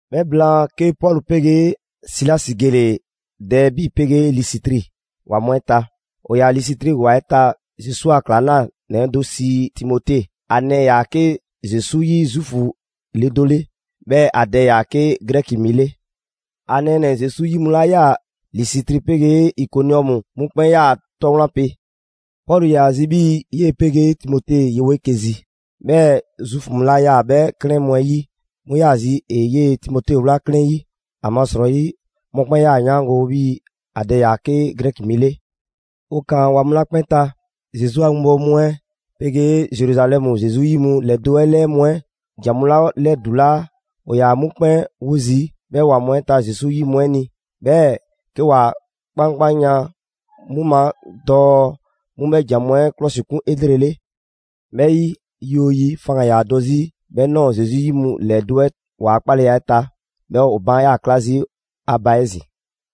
'Bhɛ blaan, 'ke Pɔlu 'pegee Silasi gele‑ Dɛɛbi 'pegee Lisitri ‑wa mu 'ɛ ta. ‑O ‑yaa Lisitri ‑wa 'ɛ ta Zesu a ‑klaŋlanɛ do sii Timote; ‑a nɛɛ ‑yaa 'ke Zesu 'yi Zuufu le do 'le, 'bhɛɛ‑ ‑a dɛ ‑yaa 'ke Grɛki mi 'le. ‑A nɛɛnɛ‑ Zesu 'yi mu 'la 'yaa‑ Lisitri 'pegee Ikoniɔmu, 'mu 'kpɛn 'yaa‑ ‑a 'tɔ wlan pe. Pɔlu ‑yaa zi 'bhii‑ 'yee‑ 'pegee Timote yewo 'eke‑ zi. 'Bhɛɛ‑ Zuufu mu 'la 'yaa‑ 'bhɛ 'klɛɛn mu 'ɛ 'yi 'mu ‑zayi', ‑e 'yee‑ Timote ꞊wlaa 'klɛɛn 'yi. ‑Amasrɔyi mɔkpɛn' ꞊yaa ‑a 'yaango‑ 'bhii‑ ‑a dɛ ‑yaa 'ke Grɛki mi 'le. ‑O ꞊kaan ‑wa mu 'la 'kpɛn ta, Zesu a 'winbɔwo mu 'ɛ 'pegee Zeruzalɛmu Zesu 'yi mu ‑lɛdo' 'ɛ 'lɛɛ mu 'ɛ ‑jan mu 'la 'lɛdulaa, ‑o ‑yaa 'mu 'kpɛn 'wo zii' 'bhɛ ‑wa mu 'ɛ ta Zesu 'yi mu 'ɛ ni. 'Bhɛɛ‑ 'ke ‑wa 'kpankpanyan 'mu ma dɔɔ 'mu 'bhɛ ‑jan mu 'ɛ 'klɔsikun 'elrele. 'Bhɛ 'yi, yi 'oo yi, faŋgan‑ ‑yaa dɔ 'zi 'bhɛ ꞊nɔɔ Zesu 'yi mu ‑lɛdo' 'ɛ ‑waa' 'kpaleya 'ɛ ta, 'bhɛɛ‑ ‑o baan' ꞊yaa 'kla zii' ‑a ba 'ezin‑.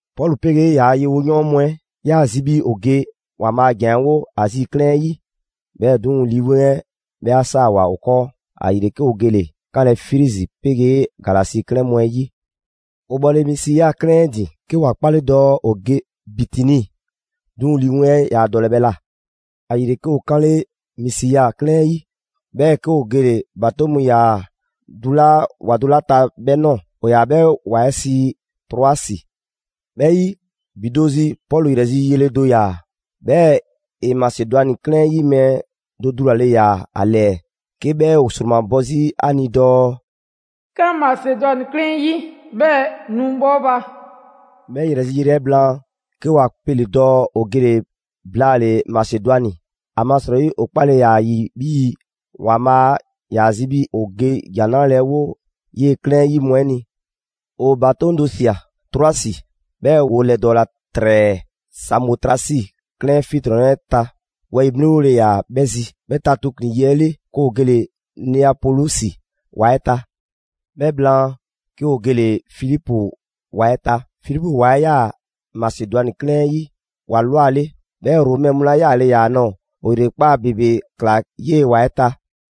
Pɔlu 'pegee ‑yaa' yewoyɔɔn mu 'ɛ 'yaa‑ zi 'bhii‑ ‑o ge ‑Waanbhaa' a ‑jan 'ɛ 'wo Azi 'klɛɛn 'ɛ 'yi, 'bhɛɛ‑ 'duŋ‑, Lii 'Weŋ 'ɛ 'bhɛ 'saawoa‑ ‑o 'kɔɔ. ‑Ayile 'ke ‑o gele‑ 'kanlɛ‑ Frizi 'pegee Galasi 'klɛɛn mu 'ɛ 'yi. ‑O bhɔle Misiya 'klɛɛn 'ɛ ‑din, 'ke ‑wa 'kpale‑ dɔɔ ‑o ge Bitini, 'duŋ‑ Lii 'Weŋ 'ɛ yaa dɔlɛ 'bhɛ ꞊la. ‑Ayile, 'ke ‑o 'kanle Misiya 'klɛɛn 'ɛ 'yi, 'bhɛɛ‑ 'ke ‑o gele‑ ‑batoŋ' mu ‑yaa dulaa' ‑wa do 'la ta 'bhɛ ꞊nɔɔ, ‑o ‑yaa 'bhɛ ‑wa 'ɛ sii Troasi. 'Bhɛ 'yi, ‑bi do zi, Pɔlu 'yrɛ zi yele do ꞊ya, 'bhɛɛ‑ ‑e Masedwani 'klɛɛn 'yi mɛɛ do dulale꞊ya ‑a ‑lɛɛ 'ke 'bhɛ ‑o ‑sromabɔ 'zi ‑a ni dɔɔ: «'Kan Masedwani 'klɛɛn 'ɛ 'yi, 'bhɛɛ‑ nu bhɔ 'o ba!» 'Bhɛ ‑yrɛ zi yele 'ɛ blaan, 'ke 'wa 'pele dɔɔ 'o gele‑ blaale‑ Masedwani. ‑Amasrɔyi 'o 'kpale‑ ‑yaa ‑a ‑yi 'bhii‑ ‑Waanbhaa' ‑yaa zi 'bhii‑ 'o ge ‑Jan 'Nrale‑ 'ɛ 'wo 'yee‑ 'klɛɛn 'ɛ 'yi mu 'ɛ ni. 'O ‑batoŋ' do ꞊sia Troasi, 'bhɛɛ‑ 'woo 'lɛdɔɔla ‑trɛɛ Samotrasi 'klɛɛn 'fiɛntrɔnnɛ 'ɛ ta: wɛyi‑ 'mliŋgole ‑yaa 'bhɛ zi. 'Bhɛ ta tooklin‑ yi 'ɛ 'le, 'ke 'o gele‑ Neapolisi ‑wa 'ɛ ta. 'Bhɛ blaan, 'ke ‑o gele‑ Filipu ‑wa 'ɛ ta. Filipu ‑wa 'ɛ ꞊yaa Masedwani 'klɛɛn 'ɛ 'yi ‑wa ꞊lwa 'le, 'bhɛɛ‑ Romɛ mu ‑la yaale ‑yaa ‑a ꞊nɔɔ. 'O ‑yrekpaa' ‑bebe ꞊kla 'yee‑ ‑wa 'ɛ ta.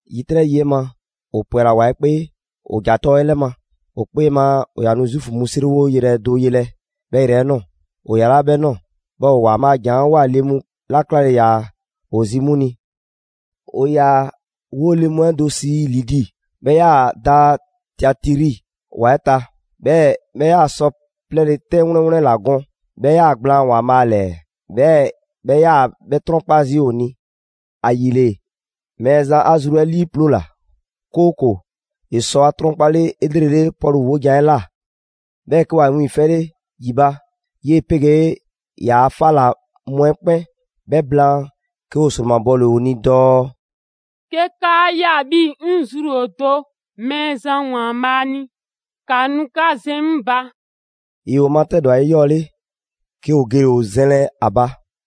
‑Yitrɛ' yi 'ɛ ma, 'o 'pwɛla‑ ‑wa 'ɛ 'kpee, 'bhɛɛ‑ 'o ‑ja tɔ 'ɛ 'lɛ ma; 'o 'kpee ma 'o 'yaa‑ nu Zuufu mu 'seriwoyrɛ do yelɛ 'bhɛ yrɛ 'ɛ ꞊nɔɔ. 'O 'yalaa 'bhɛ 'nɔɔ‑, 'bhɛɛ‑ 'o ‑Waanbhaa' a ‑jan 'ɛ ꞊woa le mu 'la 'klale‑ ‑yaa ‑o zi 'mu ni. ‑O ‑yaa 'woo‑ le mu 'ɛ do sii Lidi. 'Bhɛ ꞊yaa da Tiatiri ‑wa 'ɛ ta, 'bhɛɛ‑ 'bhɛ ‑yaa sɔ 'plɛɛle‑ 'tɛn 'wleŋ wleŋ ‑la gɔn. 'Bhɛ ‑yaa gblaan ‑Waanbhaa' ‑lɛɛ, 'bhɛɛ‑ 'bhɛ 'yaa‑ 'bhɛ 'trɔnkpa zii' 'o ni. ‑Ayile, Mɛɛzan 'a zru 'ɛ 'liiploola, 'kooko‑ ‑e sɔ ‑a 'trɔnkpale 'elrele Pɔlu 'wojan‑ 'ɛ ꞊la. 'Bhɛɛ‑ 'ke 'wa 'wiiŋfɛle ‑yi ba 'yee‑ 'pegee ‑yaa' 'fa ‑la mu 'ɛ 'kpɛn. 'Bhɛ blaan, 'ke ‑o ‑sromabɔle 'o ni dɔɔ: «'Ke 'kaa ꞊ya 'bhii‑ 'ŋ zru ‑o do Mɛɛzan ‑Waanbhaa' ni, ‑ka nu 'ka zɛn 'ŋ ba.» ‑Yoo 'o matɛdwa 'eyɔɔle, 'ke 'o gele‑ 'o zɛnlɛ ‑a ba.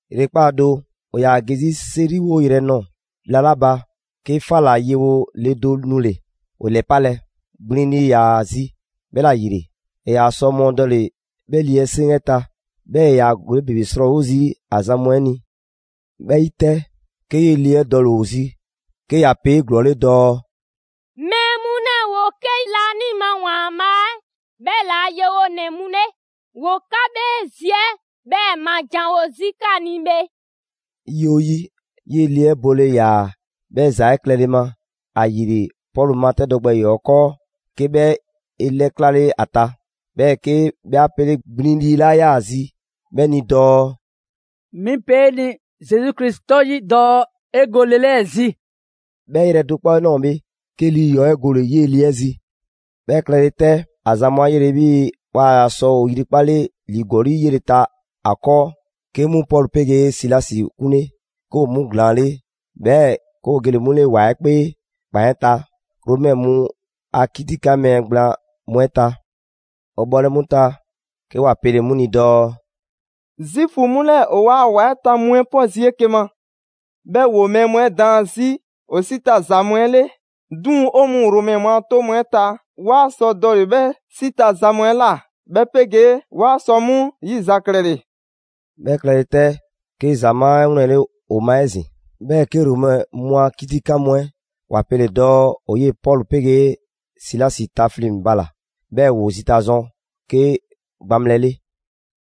‑Yrekpaa' do, 'o 'yaa‑ ge 'zi 'seriwo yrɛ 'ɛ ꞊nɔɔ bhla 'la ba, 'ke 'fa ‑la yewo le do nule‑ 'o 'lɛpalɛ: gbliŋ lii ‑yaa ‑a zi, 'bhɛla‑ ‑yile, ‑e ‑yaa sɔ mɔɔdɔle 'bhɛ lii 'ɛ 'seŋ 'ɛ ta. 'Bhɛɛ‑ ‑e ‑yaa ‑gɔli' ‑bebe 'srɔɔwo zii' ‑a zan mu 'ɛ ni. 'Bhɛ 'yi 'tɛ, 'ke 'yee‑ le 'ɛ dɔle‑ 'o zi 'ke ‑ya pe 'eglɔɔle dɔɔ: «Mɛɛ mu 'lɛɛ‑ ‑woo 'ke laanima ‑Waanbhaa' 'ɛ 'bhɛla‑ a yewonɛ mu 'le! ‑Woo 'ka 'bhee zi 'ɛ 'bhɛɛ‑ ma janwo 'zi 'ka ni bhe!» Yi 'oo yi, 'yee‑ le 'ɛ bole ‑yaa 'bhɛɛ‑ ‑za 'ɛ klɛle ma. ‑Ayile, Pɔlu matɛdɔ gbɛ ‑yɔɔ' 'ɛ 'kɔɔ, 'ke 'bhɛ 'e 'lɛklale ‑a ta, 'bhɛɛ‑ 'ke 'bhɛ 'a 'pele gbliŋ lii 'la 'yaa‑ zii 'bhɛ ni dɔɔ: «'Mi pe 'e ni Zesu Krisi 'tɔ 'yi dɔɔ 'e go le 'lɛɛ‑ zi!» 'Bhɛ yrɛ do 'kpɔ 'ɛ ꞊nɔɔ bhe, 'ke lii ‑yɔɔ' 'ɛ gole‑ 'yee‑ le 'ɛ zi. 'Bhɛ klɛle 'tɛ, ‑a zan mu 'a 'yele‑ 'bhii‑ waa ‑yaa sɔ ‑o ‑yrikpale ‑li ‑gɔli' 'yele‑ ta ‑a 'kɔɔ, 'ke 'mu Pɔlu 'pegee Silasi 'kunle, 'ke ‑o 'mu ‑glaanle', 'bhɛɛ‑ 'ke ‑o gele‑ 'mu 'le ‑wa 'ɛ 'kpee ‑kpan 'ɛ ta, Romɛ mu a 'kitikan mɛɛ gblaan mu 'ɛ ta. ‑O bhɔle 'mu ta, 'ke ‑wa pele‑ 'mu ni dɔɔ: «Zuufu mu 'lɛɛ‑, ‑o 'waa‑ ‑wa 'ɛ ta mu 'ɛ 'pɔ zii' 'eke‑ ma. 'Bhɛɛ‑ ‑woo mɛɛ mu 'ɛ daan 'zi ‑o 'si ta za mu 'ɛ 'le. 'Duŋ‑ 'o mɔɔ Romɛ mu a 'toŋ mu 'ɛ ta, 'waa sɔ dɔle‑ 'bhɛ 'si ta za mu 'ɛ ꞊la, 'bhɛ 'pegee 'waa sɔ 'mu 'yizaklɛle.» 'Bhɛ klɛle 'tɛ, 'ke ‑zamaa' 'ɛ 'wlɛnle‑ ‑o ma 'ezin‑. 'Bhɛɛ‑ 'ke Romɛ mu a 'kitikan 'mu 'ɛ ‑wa pele‑ dɔɔ ‑o 'yee‑ Pɔlu 'pegee Silasi tafleŋ‑ bala‑, 'bhɛɛ‑ ‑woo zita zɔn 'ke gbaŋbhlɛ 'le.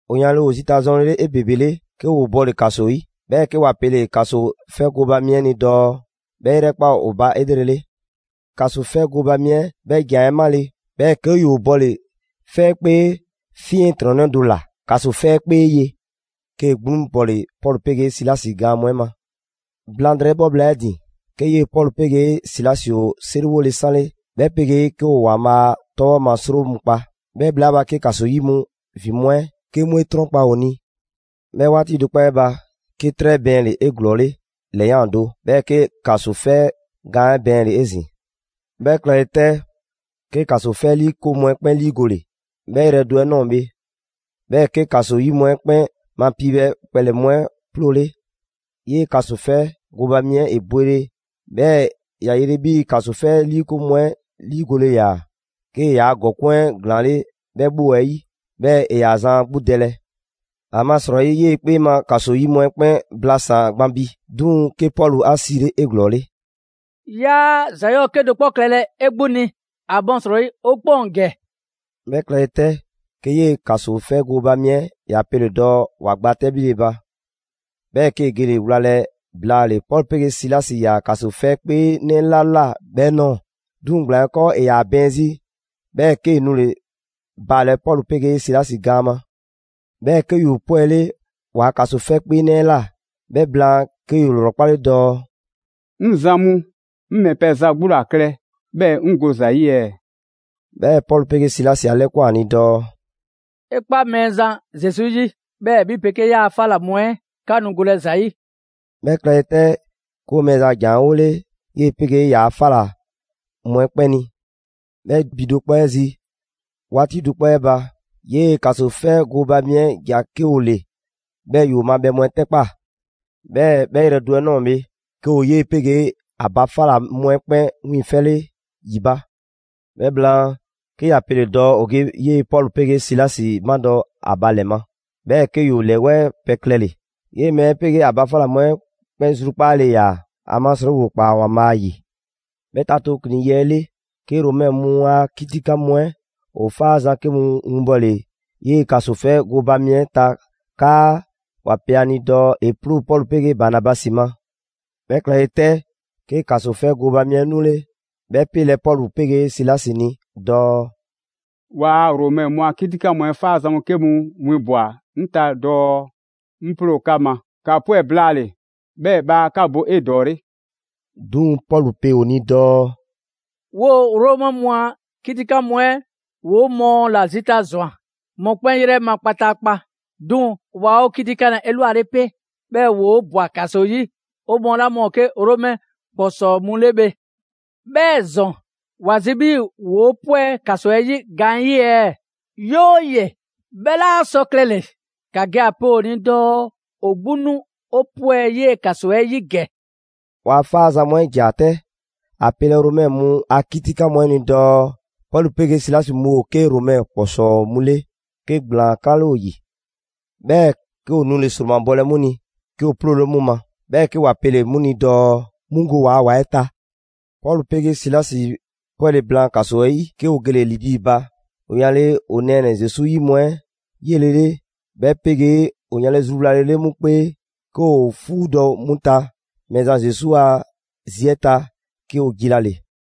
‑O yanle ‑o zita zɔnlele 'ebebele, 'ke ‑woo bɔle‑ ‑kaso 'yi; 'bhɛɛ‑ 'ke ‑wa pele‑ ‑kaso 'fɛ gooba mi 'ɛ ni dɔɔ 'bhɛ 'e 'yrɛkpa ‑o ba 'elrele. ‑Kaso 'fɛ gooba mi 'ɛ 'bhɛ ‑jan 'ɛ 'male, 'bhɛɛ‑ 'ke ‑yoo bɔle‑ 'fɛkpee 'fiɛntrɔnnɛ do ‑la ‑kaso 'fɛ 'ɛ 'kpee ye. 'Kee‑ 'gbluŋ bɔle‑ Pɔlu 'pegee Silasi gaan mu 'ɛ ma. Blaŋdrɛyi 'bhɔ bhla 'ɛ 'e ‑din, 'ke 'yee‑ Pɔlu 'pegee Silasi ‑o 'seriwole 'sanle 'bhɛ 'pegee 'ke ‑o ‑Waanbhaa' 'tɔbhɔ‑ ma 'sro mu kpa; 'bhɛ bhla 'ɛ ba, 'ke ‑kaso 'yi mu ‑vin mu 'ɛ 'ke 'mu 'e 'trɔnkpa‑ ‑o ni. 'Bhɛ 'waati do 'kpɔ 'ɛ ba, 'ke 'trɛ bɛɛnle‑ 'eglɔɔle ‑lɛyan' do, 'bhɛɛ‑ 'ke ‑kaso 'fɛ gaan 'ɛ bɛɛnle‑ 'ezin‑. 'Bhɛ klɛle 'tɛ, 'ke ‑kaso 'fɛ 'liikoŋ mu 'ɛ 'kpɛn 'liigole 'bhɛ yrɛ do 'ɛ ꞊nɔɔ bhe, 'bhɛɛ‑ 'ke ‑kaso 'yi mu 'ɛ 'kpɛn ma piibhɛ kpɛlɛ‑ mu 'ɛ 'ploole. 'Yee‑ ‑kasofɛ gooba mi 'ɛ ‑e bwele, 'bhɛɛ‑ ‑ya yele 'bhii‑ ‑kaso 'fɛ 'liikoŋ mu 'ɛ 'liigole ‑yaa; 'kee‑ ‑yaa' ‑gɔkuŋ' 'ɛ ‑glaanle' 'bhɛ 'bhoo‑ 'ɛ 'yi, 'bhɛɛ‑ ‑e ‑yaa zan ‑a 'gbu dɛlɛ. ‑Amasrɔyi 'yee‑ 'kpee ma ‑kaso 'yi mu 'ɛ 'kpɛn blasaan‑ gban bi. 'Duŋ‑, 'ke Pɔlu 'a 'siile 'eglɔɔle dɔɔ: «'Yaa ‑za 'yɔɔ‑ 'kedo‑ 'kpɔ klɛlɛ 'e 'gbu ni, ‑amasrɔyi 'o 'kpɛn ‑o ‑gɛ!» 'Bhɛ klɛle 'tɛ, 'ke 'yee‑ ‑kaso 'fɛ gooba mi 'ɛ ‑ya pele‑ dɔɔ ‑wa gba 'tɛbhile ba. 'Bhɛɛ‑ 'kee‑ gele‑ wlalɛ blaale‑ Pɔlu 'pegee Silasi ‑yaa ‑kaso 'fɛ 'kpeenɛ 'la ꞊la 'bhɛ ꞊nɔɔ. 'Duŋ‑ ‑gblaan 'ɛ 'kɔɔ, ‑e ‑yaa bɛɛn 'zi, 'bhɛɛ‑ 'kee‑ nule‑ baalɛ Pɔlu 'pegee Silasi gaan ma. 'Bhɛɛ‑ 'ke ‑yoo 'pwɛle ‑waa' ‑kaso 'fɛ 'kpeenɛ ꞊la. 'Bhɛ blaan, 'ke ‑yoo ‑lrɔkpale dɔɔ: «'Ŋ zan mu, 'ŋ ‑mɛ pɛ za 'gbu ‑la klɛ 'bhɛɛ‑ 'ŋ go ‑za 'yi ɛɛ?» 'Bhɛɛ‑ Pɔlu 'pegee Silasi 'a 'lɛkwan‑ ‑a ni dɔɔ: «'E 'kpa Mɛɛzan Zesu 'yi, 'bhɛɛ‑ 'bhi 'pegee 'yaa‑ 'fa ꞊la mu 'ɛ 'ka nu golɛ ‑za 'yi.» 'Bhɛ klɛle 'tɛ, 'ke ‑o Mɛɛzan a ‑jan 'ɛ 'wole 'yee‑ 'pegee ‑yaa' 'fa ꞊la mu 'ɛ 'kpɛn ni. 'Bhɛ ‑bi do 'kpɔ 'ɛ zi 'waati do 'kpɔ 'ɛ ba, 'yee‑ ‑kaso 'fɛ 'ɛ gooba mi 'ɛ ‑ja 'ke ‑o ‑le, 'bhɛɛ‑ ‑yoo ma bhɛ mu 'ɛ 'tɛkpaa꞊. 'Bhɛɛ‑ 'bhɛ yrɛ do 'ɛ ꞊nɔɔ bhe, 'ke ‑o 'yee‑ 'pegee ‑a ba 'fa ‑la mu 'ɛ 'kpɛn 'wiiŋfɛle ‑yi ba. 'Bhɛ blaan, 'ke ‑ya pele‑ dɔɔ ‑o ge 'yee‑ Pɔlu 'pegee Silasi 'madɔ‑ ‑a ba ‑lɛ ma. 'Bhɛɛ‑ 'ke ‑yoo ‑lɛwɛɛ' pɛ klɛle‑. 'Yee‑ mɛɛ 'ɛ 'pegee ‑a ba 'fa ‑la mu 'ɛ 'kpɛn zrukpaale ‑yaa, ‑amasrɔyi ‑woo ‑kpaa ‑Waanbhaa' 'yi. 'Bhɛ ta tooklin‑ yi 'ɛ 'le, 'ke Romɛ mu a 'kitikan mu 'ɛ ‑o 'faazan‑ 'ke mu winbbɔle 'yee‑ ‑kaso 'fɛ gooba mi 'ɛ ta 'kaa ‑wa pe ‑a ni dɔɔ ‑e 'ploo Pɔlu 'pegee Banabasi ma. 'Bhɛ klɛle 'tɛ, 'ke ‑kaso 'fɛ gooba mi 'ɛ nule‑ 'bhɛ 'pelɛ‑ Pɔlu 'pegee Silasi ni dɔɔ: «'Waa‑ Romɛ mu a kitikan mu 'ɛ 'faazan‑ mu 'ke mu winbwa꞊ 'ŋ ta dɔɔ 'ŋ 'ploo‑ 'ka ma. ‑Ka 'pwɛ blaale‑! 'Bhɛɛ‑ bhaa 'ka bo 'edɔɔle!» 'Duŋ‑ Pɔlu pe ‑o ni dɔɔ: «'Woo‑ Romɛ mu a 'kitikan mu 'ɛ ‑woo 'o mɔɔ ‑la zita ꞊zwan mɔkpɛn' 'yrɛ ma kpataakpa; 'duŋ‑ waa 'o 'kitikanlɛ 'elwale pe, 'bhɛɛ‑ ‑woo' ꞊bwa ‑kaso 'yi, 'o mɔɔ 'la 'o mɔɔ ‑o 'ke Romɛ ‑kpɔsɔɔ mu 'le bhe. 'Bhɛɛ‑ ‑zɔn, ‑wa zi 'bhii‑ ‑woo' 'pwɛ ‑kaso 'ɛ 'yi gaanyi' ɛɛ? 'Yooye‑, 'bhɛ 'laa sɔ klɛle‑! ‑Ka ge ‑a pe ‑o ni dɔɔ ‑o 'gbu nu 'o 'pwɛ 'yee‑ ‑kaso 'ɛ 'yi ‑gɛ.» ‑Waa' 'faazan‑ mu 'ɛ ‑ja 'tɛ ‑a pelɛ Romɛ mu a 'kitikan mu 'ɛ ni dɔɔ Pɔlu 'pegee Silasi mu ‑o 'ke Romɛ ‑kpɔsɔɔ mu 'le, 'ke ‑gblaan 'klale ‑o ‑yi. 'Bhɛɛ‑ 'ke ‑o nule‑ ‑sromabɔlɛ 'mu ni, 'ke ‑o 'ploole 'mu ma, 'bhɛɛ‑ 'ke ‑wa pele‑ 'mu ni dɔɔ 'mu go waa ‑wa 'ɛ ta. Pɔlu 'pegee Silasi 'pwɛle‑ blaan ‑kaso 'ɛ 'yi, 'ke ‑o gele‑ Lidi ba. ‑O yanle ‑o nɛɛnɛ‑ Zesu 'yi mu 'ɛ 'yelele 'bhɛ 'pegee ‑o yanle zruwlalele 'mu 'kpee, 'ke ‑o 'fuudɔ‑ 'mu ta Mɛɛzan Zesu a zi 'ɛ ta, 'ke ‑o jilale.